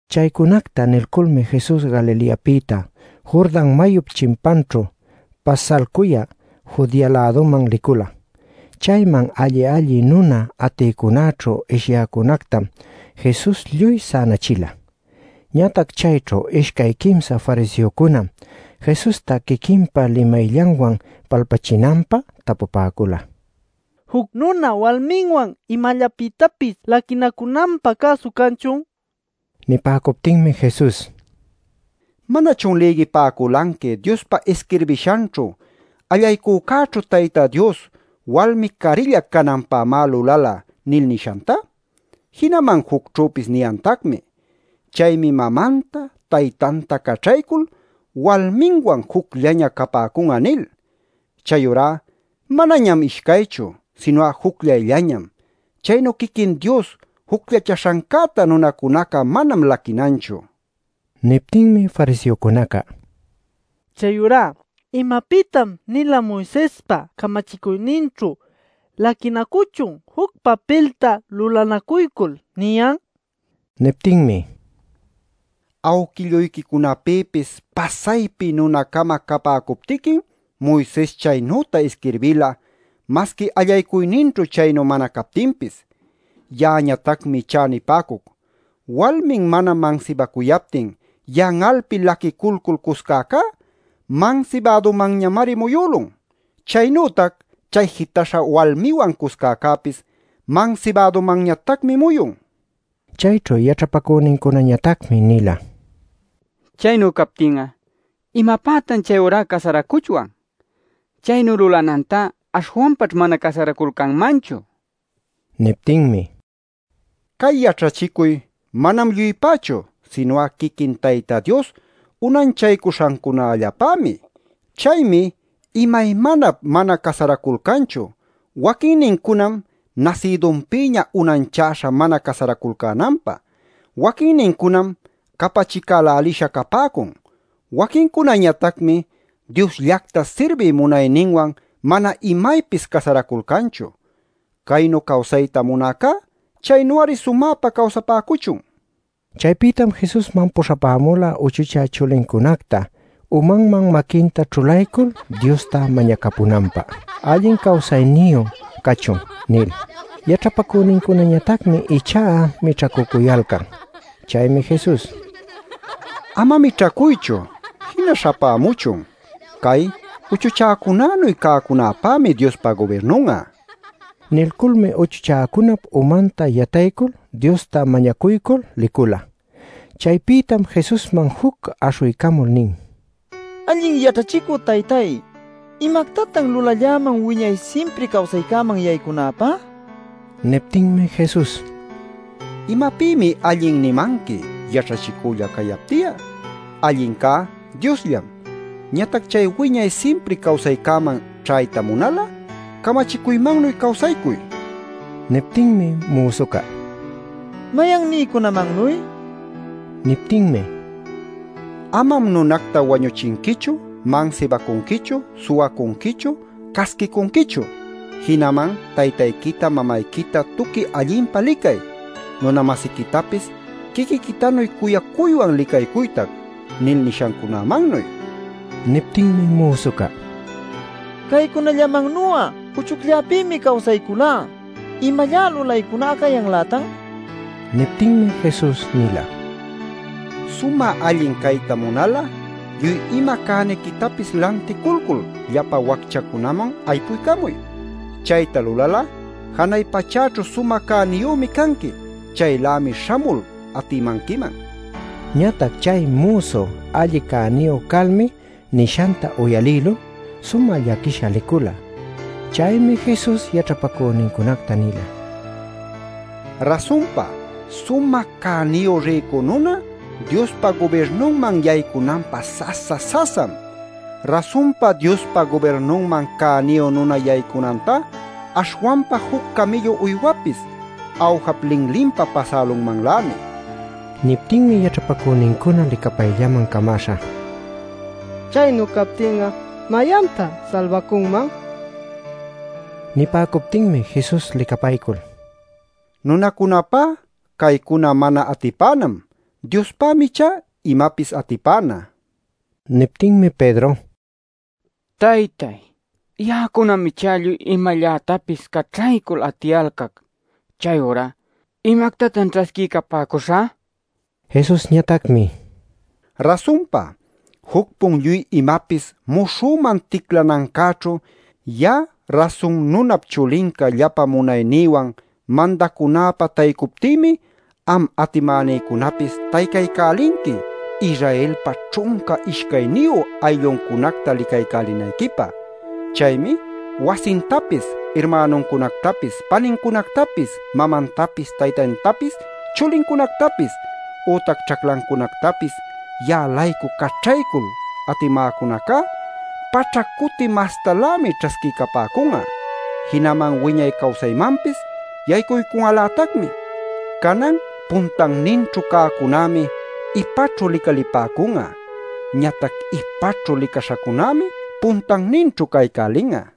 Chaycunacta niyculmi Jesus Galileapïta Jordan mayup chimpanćhu pasalcuyä Judea-läduman licula. Chayman alli-alli nuna atïcunäćhu ishyäcunätam Jesus lluy sänachila. Ñatac chayćhu ishcay-quimsa fariseocunam Jesusta quiquinpa limayllanwan palpachinanpä tapupäcula: “¿Juc nuna walminwan imallapïtapis laquinacunanpä cäsu canchun?” nil. Nipäcuptinmi Jesus: “¿Manachun lïgipäculanqui Diospa isquirbishanćhu ‘Allaycuycäćhu Tayta Dios walmi carilla cananpämá lulala’ nil nishanta? Jinaman jucćhüpis niyantacmi: ‘Chaymi mamanta, taytanta caćhaycul walminwan jucllaña capäcun'a’ nil. Chayurá manañam ishcaychu, sinu'a jucllayllañam. Chaynu quiquin Dios jucllachäśhancäta nunacunaca manam laquinanchu” nin. Niptinmi fariseocunaca: “Chayurá ¿imapïtan-nila Moisespa camachicuyninćhu ‘Laquinacuchun juc papilta lulanacuycul’ niyan?” nin. Niptinmi: “Awquilluyquicunapïpis pasaypi nuna-cama capäcuptiquim Moises chaynüta isquirbila, masqui allaycuyninćhu chaynu mana captinpis. Ya'añatacmi ichá nipäcuc: walmin mana mansibacuyaptin yan'alpi laquiculcul cuscäcá mansibädumanñamari muyülun. ˻Chaynütac chay jitaśha walmiwan cuscäcäpis mansibädumanñatacmi muyun˼” nin. Chayćhu yaćhapacünincunañatacmi nila: “Chaynu captin'a ¿imapätan chayurá casaracuchwan? Chaynu lulanantá aśhwanpaćh mana casaraculcanmanchu” nil. Niptinmi: “Cay yaćhachicuy manam lluypächu, sinu'a quiquin Tayta Dios unanchaycuśhancunallapämi. Chaymi imaymanap mana casaraculcanchu. Waquinnincunam nasïdunpïña unanchaśha mana casaraculcänanpä. Waquinnincunam capachicälälisha capäcun. Waquincunañatacmi Diosllacta sirbiy munayninwan mana imaypis casaraculcanchu. Caynu cawsayta munäcá chaynu-ari sumäpa cawsapäcuchun” nin. Chaypïtam Jesusman puśhapämula uchuchä chulincunacta, umanman maquinta ćhulaycul Diosta mañacapunanpä “allin cawsayniyu cachun” nil. Yaćhapacünincunañatacmi ichá mićhacücuyalcan. Chaymi Jesus: “Ama mićhacuychu; jina śhapämuchun. Cay uchuchäcunanuy cäcunapämi Diospa gubirnun'a” nila. Nilculmi uchuchäcunap umanta yataycul Diosta mañacuycul licula. Chaypïtam Jesusman juc aśhuycamul nin: “Allin yaćhachicü Taytay, ¿imactatan lulalläman wiñay simpri cawsaycäman yaycunäpä?” nil. Niptinmi Jesus: “¿Imapïmi ‘allin’ nimanqui yaćhachicülla cayapti'a? Allincá Diosllam. Ñatac chay wiñay simpri cawsaycäman ćhayta munal'a camachicuymannuy cawsaycuy” nin. Niptinmi müsuca: “¿Mayannincunamannuy?” nin. Niptinmi: “ ‘Amam nunacta wañuchinquichu, mansibacunquichu, suwacunquichu, casquicunquichu. Jinaman taytayquita mamayquita tuqui allinpa licay, nuna-masiquitapis quiquiquitanuy cuyacuywan licaycuytac’ nil nishancunämannuy” nin. Niptinmi müsuca: “Caycunallamannu'a uchucllapïmi cawsayculá. ¿Imallá lulaycuná cayanlätan?” nin. Niptinmi Jesus nila: “Sumä allin cayta munal'a, lluy ima cäniquitapis lanticulcul llapa wacchacunaman aypuycamuy. Chayta lulal'a janay pachäćhu sumä cäniyümi canqui. Chaylämi śhamul atimanquiman” nin. Ñatac chay müsu alli cäniyu calmi nishanta uyalïlul sumä llaquisha licula. Chaymi Jesus yaćhapacünincunacta nila: “Rasunpa, sumä cäniyu rïcu nuna Diospa gubirnunman yaycunanpä sasa-sasam. Rasunpa Diospa gubirnunman cäniyu nuna yaycunantá aśhwanpa juc camïllu uywapis awjap linlinpa pasälunmanlämi” nil. Niptinmi yaćhapacünincuna licapayllaman camäśha: “Chaynu captin'a ¿mayantá salbacunman?” ninaculcäla. Nipäcuptinmi Jesus licapaycul: “Nunacunapá caycuna mana atipänam. Diospämi ichá imapis atipäna” nila. Niptinmi Pedro: “Taytay, Ya'acunam ichá lluy imallätapis caćhaycul atiyalcac. Chayurá ¿imactatan ćhasquiycapäcuśhä?” nin. Jesusñatacmi: “Rasunpa, juc-pun lluy imapis muśhüman ticlacanancäćhu, ya'a Rasun Nunap Chulinca llapa munaynïwan mandacunäpä taycuptïmi, am atimänïcunapis taycaycälinqui Israelpa ćhunca ishcayniyu aylluncunacta licaycälinayquipä. Chaymi wasintapis, irmänuncunactapis, panincunactapis, mamantapis taytantapis, chulincunactapis, ütac ćhaclancunactapis ya'a-laycu caćhaycul atimäcunacá, paćhac cuti mastalämi ćhasquipäcun'a. Jinaman wiñay cawsaymanpis yaycun'alätacmi. Canan puntanninćhu cäcunämi ipaćhu licalipäcun'a; ñatac ipaćhu licaśhacunämi puntanninćhu caycälin'a.